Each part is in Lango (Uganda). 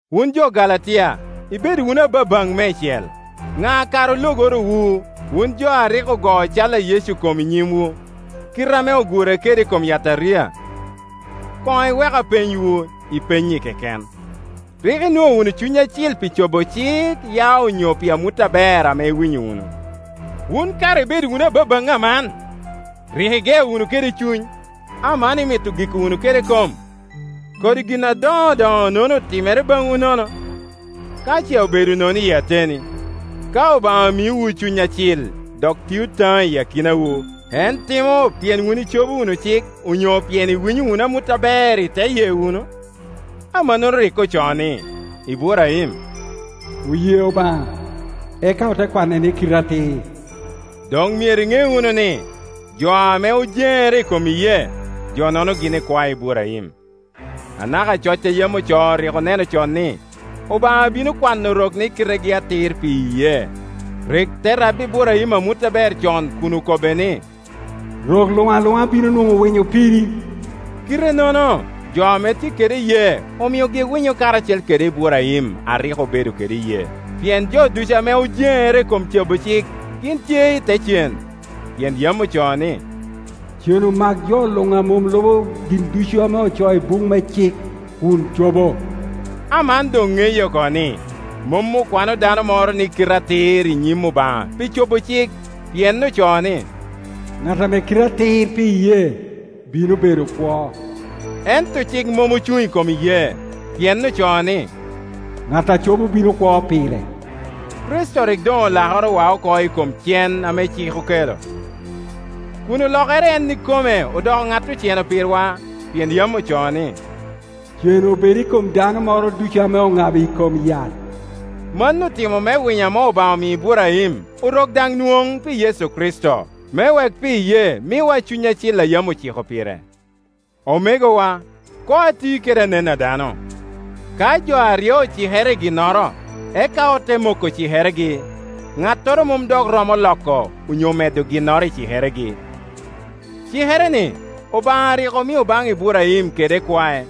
Wun jo Galatia, ibedo wunu ababaŋ meicel! Ŋa kara ologoro wu, wun jo a rik ogoo cal a Yecu kom i nyimwu, kite ame ogure kede i kom yataria? Koŋ iwek apenywu i penynyi keken: rik inwoŋo wunu Cuny Acil pi cobo cik, ya nyo pi amut aber ame iwinyo wunu? Wun kara ibedo wunu ababaŋ aman! Rik igeo wunu kede Cuny, aman imito giko wunu kede kom? Kodi gin adoŋodoŋonono otimere baŋwu nono ka ce obedo nono iyi ateni. Ka Obaŋa miowu Cuny Acil, dok tio taŋo i akinawu, en timo pien wun icobo wunu cik, onyo pien iwinyo wunu amut aber iteye wunu? Amannono rik ocoo ni, Iburaim “Oye Obaŋa, eka ote kwane ni kite atir.” Doŋ myero iŋe wunu nijo ame ojeŋere i kom iyee, jo-nono gin ikwae Iburaim. Anaka coc a yam ocoo rik oneno con ni, Obaŋa bino kwano Orok ni kitegi atir pi iyee. Rik te rabbi Iburaim amut aber con kun okobbe ni, “Rok luŋ aluŋa bino nwoŋo winyo piri.” Kitenono, jo ame tye kede iyee omiogi winyo karacel kede Iburaim a rik obedo kede iyee. Pien jo ducu ame ojeŋere i kom cobo cik gin tye i te cen; pien yam ocoo ni, “Cen omak jo luŋ ame mom lubo gin ducu ame ocoo i buk me cik, kun cobo.” Aman doŋ ŋeye oko ni, mom okwano dano moro ni kite atir i nyim Obaŋa pi cobo cik; pien ocoo ni, “Ŋat ame kite atir pi iyee, bino bedo kwo.” Ento cik mom ocuŋ i kom iyee, pien ocoo ni, “Ŋat a cobo bino kwo pire,” Kricito rik doŋ olakorowa oko i kom cen ame cik okelo, kun olokere en ikome odoko ŋat oceno pirwa. Pien yam ocoo ni, “Cen obed i kom dano moro ducu ame oŋabo i kom yat.” Mano otimo me winyo ame Obaŋa omio Iburaim Orok daŋ nwoŋ, pi Kricito Yecu, me wek pi iyee miwa Cuny Acil a yam ociko pire. Omegowa, koŋ ati kede anen a dano. Ka jo aryo ocikere i ginnoro, eka ote moko cikeregi, ŋattoro mom dok romo loko onyo medo ginnoro i cikeregi. Cikere-ni Obaŋa rik omio baŋ Iburaim kede ikwae;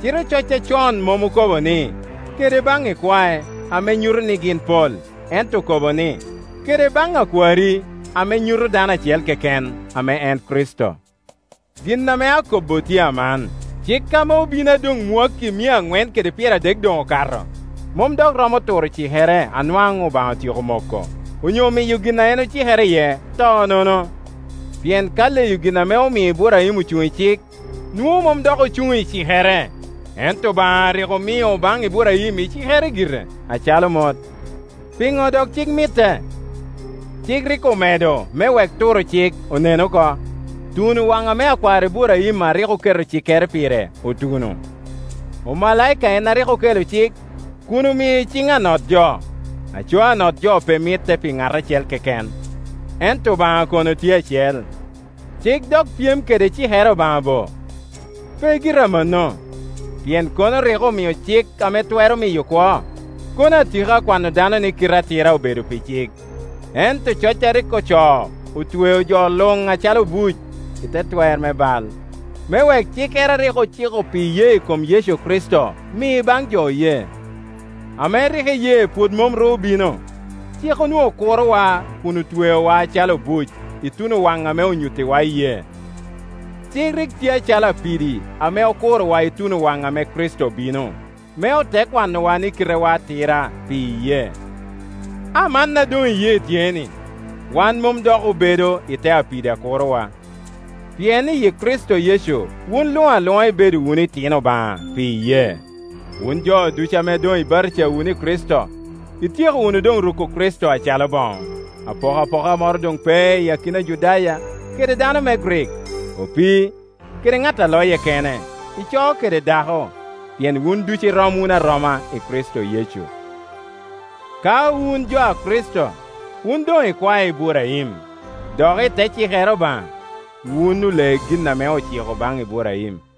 cite coc acon mom okobo ni, “Kede baŋ ikwae,” ame nyuto ni gin pol, ento okobo ni, “Kede baŋ akwari,” ame nyuto dano acel keken, ame en Kricito. Gin ame akobbo tye aman: cik ame obino a doŋ mwakki mia aŋwen kede pyeradek doŋ okato, mom dok romo turo cikere a nwaŋ Obaŋa otyeko moko, onyo miyo gin a en ocikere iye to nono. Pien ka leyo gin ame omio Iburaim ocuŋ i cik, nwoŋo mom dok ocuŋ i cikere. Ento Obaŋa rik omio baŋ Iburaim i cikere gire, acalo mot. Piŋo dok cik mitte? Cik rik omedo me wek turo cik onen oko, tuno waŋ ame akwar Iburaim a rik oketo cikere pire otuno. Omalaika en a rik okelo cik, kun omio i ciŋ anot-jo. Aco anot-jo pe mitte pi ŋat acel keken, ento Obaŋa kono tye acel. Cik dok pyem kede cikere Obaŋa bo? Pe gire amanno; pien kono rik omio cik ame twero miyo kwo, kono atika kwano dano ni kite atira obedo pi cik. Ento coc a rik ocoo otweo jo luŋ acalo obuc i te twer me bal, me wek cikere a rik ociko pi iyee i kom Yecu Kricito mi baŋ jo oye. Ame rik iyee pwod mom ru obino, cik onwoŋo kuro-wa kun otweowa acalo obuc, ituno wan ame onyuttiwa iyee. Cik rik tye acalo apidi ame okurowa ituno waŋ ame Kricito obino, me ote kwanowa ni kitewa atira pi iyee. A man a doŋ iyee tye-ni, wan mom dok obedo i te apidi a kurowa; pien iyi Kricito Yecu wun luŋ aluŋa ibedo wunu itino Obaŋa pi iyee. Wun jo ducu ame doŋ ibatija wunu i Kricito, ityeko wunu doŋ ruko Kricito acalo boŋo. Apokapoka moro doŋ pe i kin Ajudaya kede dano me Grik, opii kede ŋat a loye kene, ico kede dako; pien wun ducu irom wunu aroma i Kricito Yecu. Ka wun jo a Kricito, wun doŋ ikwae Iburaim; dok i te cikere Obaŋa, wun ole gin ame ociko baŋ Iburaim.